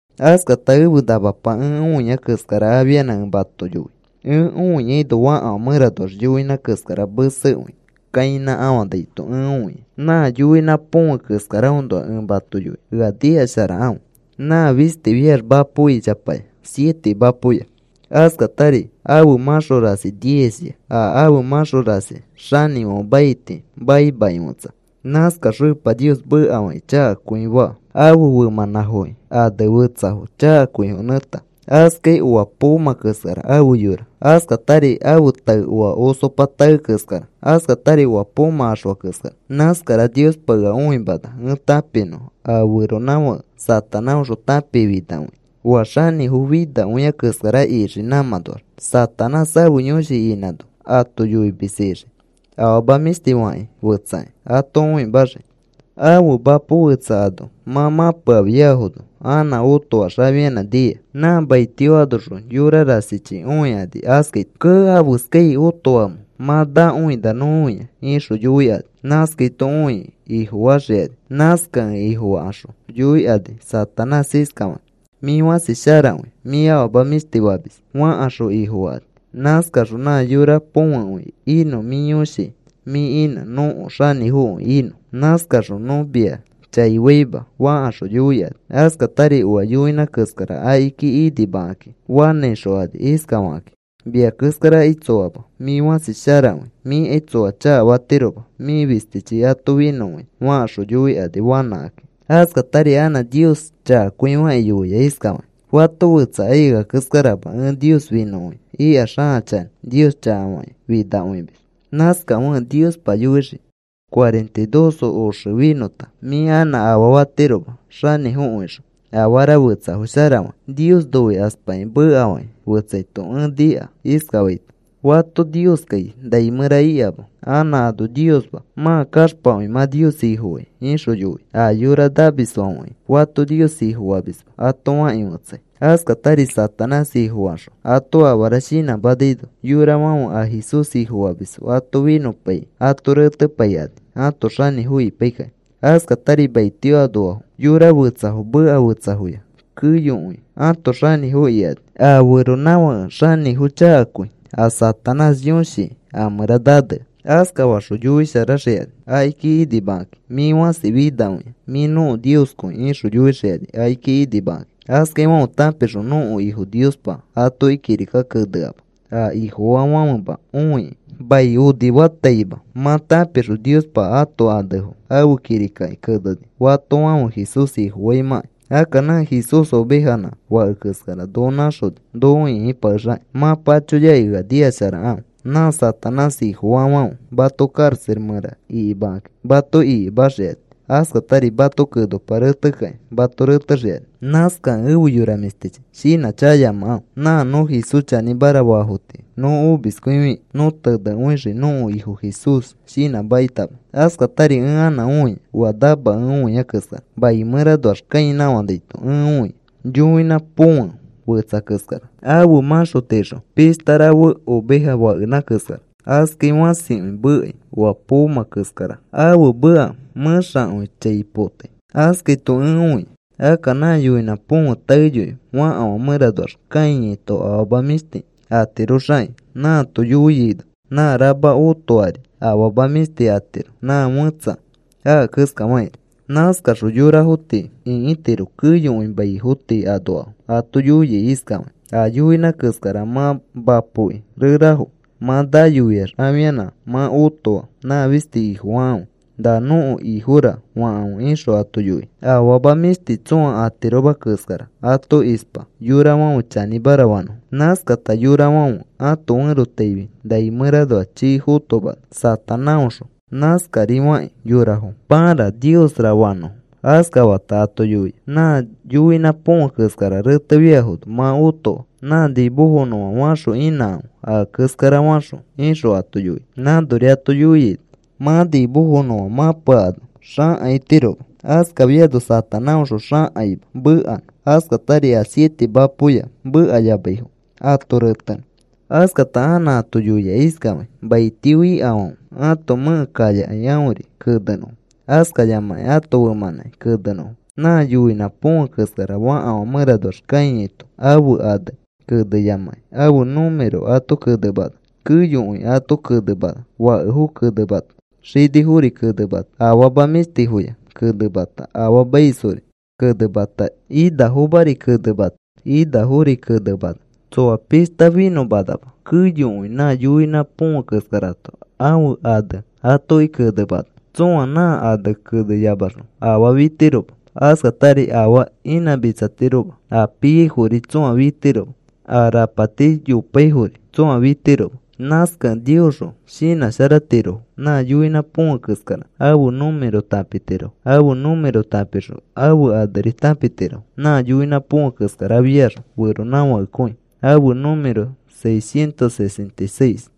Askata ẽfe namapa ẽ õia keskara afianã ẽ mato yoi. Ẽ õiaino fakafã mẽranoax yoinã keskara mesekõi kãinãkafanaito ẽ õia. Nã yoinã põfe keskaraõnoa ẽ mato yoinõ. Ea nikasharakãfe. Nã fistifiax mapo ichapaya, siete mapoya. Askatari ãfe mãxo rasi diezya. A ãfe mãxo rasi xanĩfãfe maiti maimakĩ fetsa. Nãskaxõ Epa Nios mekafakĩ chakakõi faa. Ãfe femãnãfoki ane fetsafo chakakõifo nẽta. Askai oa poomã keskara ãfe yora. Askatari ãfe tae oa osopa tae keskara. Askatari oa poomã axfa keskara. Nãskara Niospa ea õimana ẽ tãpinõ a feronãfãke Satanáõxõ tãpikifinakõia, oa xanĩfo finakõia keskara ixii nãmãnoax. Satanás ãfe yõshi inãno ato yoimis ixii, afama mĩshti fakĩ fetsaki ato õimaxii. Ãfe mapo fetsa ano mã mãpeafiafono anã otoax afianã nia. Nã mai tio anoxõ yora rasichi õikani askaito: “Kee, ¿afeskax otoamẽ mã nãkõina nõ õia?” ixõ yoikani. Nãskaito õikĩ ifofaxikani. Nãskakẽ ifofakaxõ yoikani Satanás iskafakĩ: “Mĩ fãsi sharakõi. Mĩ afama mĩshti famis,” fakaxõ ifofakani. “Nãskaxõ nã yora põfekõi inõ mĩ yõshi mĩ inã nõko xanĩfokõi inõ. Nãskaxõ nõ mia chai faima,” fakaxõ yoikani. Askatari oa yoinã keskara akiki inimakakĩ fanãixokani iskafakakĩ: “Mia keskarakai tsoama. Mĩ fãsi sharakõi. Miakai tsõa chakafatiroma. Mĩ fistichi ato finõkõia,” fakaxõ yoikani fanãikakĩ. Askatari anã Nios chakakõifakĩ yoia iskafakĩ: “Fato fetsakai ea keskarama. Ẽ Nios finõkõia,” ikax, ãa chanĩ Nios chakafakĩ finakõimis. Nãskafekẽ Niospa yoixii: “Cuarenta y dos oxe finõta mĩ anã afaa fatiroma xanĩfokõixõ afara fetsafo sharafakĩ.” Nios noikaspakĩ mekafakĩ fetsaito ẽ nika iskafaito: “Fato Nioskai nai mẽra ikama. Anã ano Niosma. Mã kaxpakõi mã Nios Ifofai,” ixõ yoia. “A yora namisfãfekai fato Nios Ifofamisma,” ato fakĩ fetsai. Askatari Satanás ifofakaxõ ato afara shinãmãnaino yorafãfe a Jesús Ifofamisfo ato finõpaikĩ ato retepaikani ãto xanĩfo ipaikakĩ. Askatari maitio anoafo, xoko fetsafo, meka fetsafoya keyokõi ãto xanĩfo ikani a feronãfake xanĩfo chakakõi a Satanás yõshi a mẽra nanea. Askafaxõ yoisharaxikani akiki inimakakĩ: “Mĩ fãsi finakõia, mĩ nõko nioskõi,” ixõ yoixikani akiki inimakakĩ. Askaifãfe tãpixõ nõko Ifo Niospa atoki kirika keneama a Ifofaafãfema õikĩ. Mai onifataima mã tãpixõ Niospa ãto anefo ãfe kirikaki keneni fatofãfe Jesús Ifofaimãkai. Akka nã Jesús ovejanã fake keskara noko nãxoni noko ĩkipakexakĩ. Mã pachoyakĩ ea nikasharakãfe. “Nã Satanás ifofaafãfe mato karaxa mẽra ikimakaki mato ikimaxikani. Askatari mato kenopa retekakĩ mato retexikani.” Nãskakẽ efe yora mĩshtichi, shinãchakayamakãfe. Nã nõ Jesús chanĩmara faafo tii nõ omiskõifikĩ, nõ tenekõixii nõko Ifo Jesús shinãmakitama. Askatari ẽ anã õia oa namakẽ õia keskara. Mai mẽranoax kãinãkafanaito ẽ õia yoinã põfe fetsa keskara. Ãfe mãxo tiixo pishta rafe oveja fakenã keskara. Askai fãsikõi mekai oa poomã keskara ãfe meka mẽxakõi chai potai. Askaito ẽ õia. Akka nã yoinã põfe taeyoi fakafã mẽranoax kãiyaito afama mĩshti atiroxakĩ nãato yoiaino nã rama oatori afama mĩshti atiro nã fẽtsa aka keskafakĩri nãskaxõ yorafo tii ĩkitiro. Keyokõi maifo tii anoafo ato yoia iskafakĩ: “A yoinã keskara mã mapoki rerafo mã nayofiax afianã mã otoa nã fisti ifofakãfe. ‘Na nõko ifora,’ fakãfe,” ixõ ato yoia. Afama mĩshti tsõa atiroma keskara ato ispa yorafãfe chanĩmara fanõfo. Nãskata yorafãfe ãto ferotaifi nai mẽranoa chii fotomana. Satanáõxõ nãskarifakĩ yorafo pãra niosra fanõfo. Askafata ato yoia: “Nã yoinã põfe keskara retefiafono mã otoa nã nimofonõfã faxõ inãkãfe a keskara faxõ,” ixõ ato yoia. Nãnori ato yoiaino mã nimofonõfã mãpeakano xãkaitiroma. Askafiano Satanáõxõ xãkaima mekanõ, askatari a siete mapoya mekayamaifo ato retenõ. Askata anã ato yoia iskafakĩ: “Maitio ikafãfe ãto mẽke kayakai aõri kenenõfo askayamakĩ ãto femãnãki kenenõfo.” Nã yoinã põfe keskara fakafã mẽranoax kãiato ãfe ane keneyamakĩ ãfe número ato kenemana. Keyokõi ato kenemana. Fakefo kenemata, xinifori kenemata, afama mĩshtifoyari kenemata, afaamaisfori kenemata, inafomari kenemata, inafori kenemana. Tsoa pishta finõmanama. Keyokõi nã yoinã põfe keskarato ãfe ane atoki kenemana. Tsõa nã ane keneyamaxõ afaa fitiroma. Askatari afaa inãmitsatiroma a piaifori tsõa fitiroma, a rapati yopaifori tsõa fitirofoma. Nãskakẽ Niosxõ shinãsharatirofo nã yoinã põfe keskara ãfe número tãpitirofo. Ãfe número tãpixõ ãfe aneri tãpitirofo. Nã yoinã põfe keskarafiax feronãfakekõi, ãfe número seiscientos sesenta y seis.